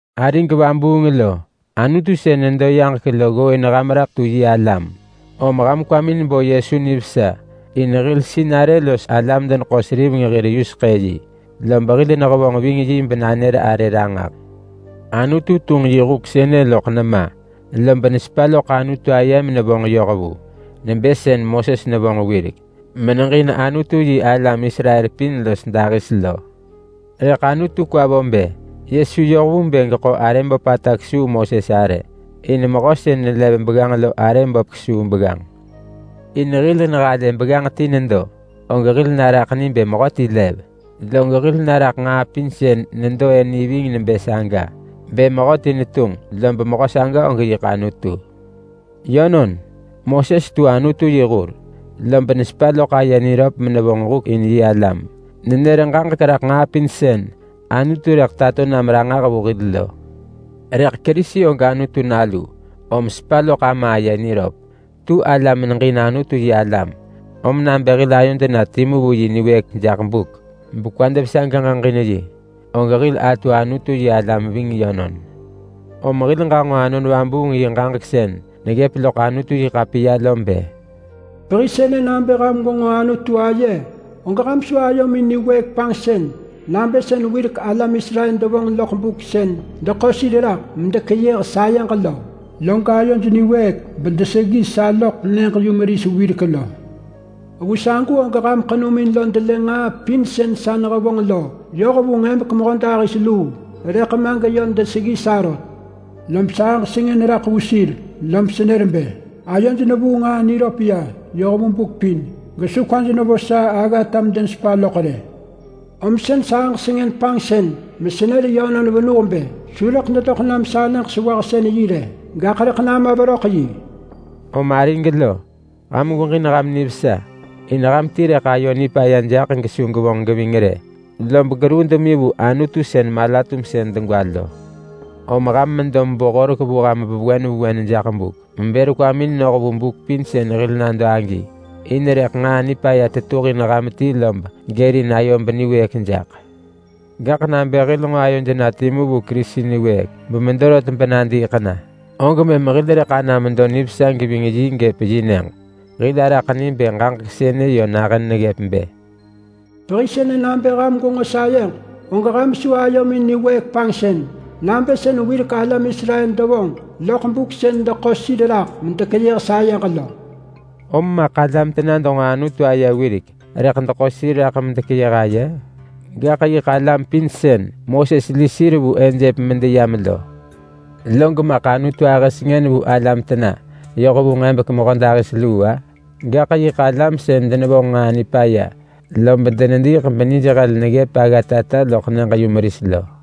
Arig vabuung lo, Anutu sën nedo yaġek lo ggooin ham raḳ tu yi alam. Om ham kwamin bo Yesu nivesa in hil sinarë los hil alam-deneḳo-seriveng hir yuseḳë yi, lob hil nehevonġ ving yi benanër arë ranġah. Anutu tunġ yi huk sënë loḳ nema, lob nesepa loḳ Anutu aye menevonġ yoh vu, nebë sën Moses nevonġ wirek meneġin Anutu-yi-alam Israel pin los dahis lo. Rëḳ Anutu kwa vo bë Yesu yoh vu bë geḳo arë böpata kesuu Moses arë. In mehö sën nelev begganġ lo arë böp kesuu begganġ. In hil nehalë begganġ ti nedo, og hil naraḳ ni bë mehöti lev, log hil naraḳ nġaa pin sën nedo-ë ni ving nebë saga bë mehöti netunġ, lob mehö saga og yiḳ Anutu. Yönon, Moses tu Anutu yi hur, lob nesepa loḳ aye niröp menevonġ huk in yi alam. Nenër ġaġek raḳ nġaa pin sën Anutu rëḳ tato nam ranġah vu hil lo. Rëḳ Kerisi og Anutu Nalu, om sepa loḳ Ama aye niröp. Tu ala meneġin Anutu-yi-alam, om nabë hil ayod na timu vu yi niwëëk jaḳ buk, bekwad vesa geġeġin yi, og hil atu Anutu-yi-alam ving yönon. Om hil ġanġo Anon Vabuung yi ġaġek sën neggëp loḳ Anutu-yi-ḳapiya lo bë: “Pehi sënë nabë ham gwenġo Anutu aye, og ham su ayomin niwëëk panġsën nabë sën wirek alam Israel devonġ loḳ buk sën deḳo sir raḳ medekeyëh sayeġ lo, log ayoj niwëëk bedeseggi sa loḳ nyëġ-yumeris wirek lo. Vu sagu og ham ḳenumin lo delë nġaa pin sën sa nehevonġ lo yoh vu nġebek mehödahis luu, rëḳ ma geyö deseggi sa rot. Lob sahëġ sengën raḳ vu sir lob senër bë, ‘Ayoj nevuu nġaa niröp ya yoh vu buk pin, gesu kwaj nevo sa aggata medenesepa loḳ rë.’ Om sën sahëġ sengën panġsën mesenër yönon venuh bë, ‘Su rëḳ dedoḳ nam sa nyëġ-sewahsën-yi rë, gaḳ rëḳ nama veröḳ yi.’” Om arig lo, ham gweġin ham nivesa. In ham ti rëḳ ayo nipaya jaḳ gesu gevonġ geving rë, lob geruu demi vu Anutu sën mala-tumsën degwa lo. Om ham medo mebo horek vu ham vewen vewen jaḳ buk mebër kwamin noh vu buk pin sën hil nado agi, in rëḳ nġaa nipaya tetuhin ham ti lob gërin ayo beniwëëk jaḳ. Gaḳ nabë hil nġo ayod na timu vu Kerisi niwëëk bemedo rot benadiiḳ na, og mëm hil rëḳ ana medo nivesa geving yi gëp yi nyëġ. Hil araḳ ni bë ġaġek sënë yö nahën neggëp bë: “Pehi sënë nabë ham gwenġo Anutu aye, og ham su ayomin niwëëk panġsën nabë sën wirek alam Israel devonġ loḳ buk sën deḳo sir raḳ medekeyëh sayeġ lo.” Om maḳ alam tena denġo Anutu aye wirek rëḳ deḳo sir raḳ medekeyëh aye? Gaḳ yiḳ alam pin sën Moses li sir vu Ejep medeyam lo! Log maḳ Anutu ahë sengën vu alam tena yoh vu nġebek mehödahis luu-a? Gaḳ yiḳ alam sën denevonġ nġaa nipaya lob denediiḳ benij hel to neggëp aggatata loḳ nyëġ-yumeris lo.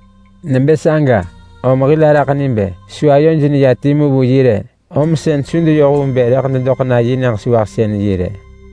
Nebë saga om hil araḳ ni bë su ayoj neya timu vu yi rë, om sën su deyoh vu bë rëḳ dedoḳ na yi nyëġ-sewahsën-yi rë.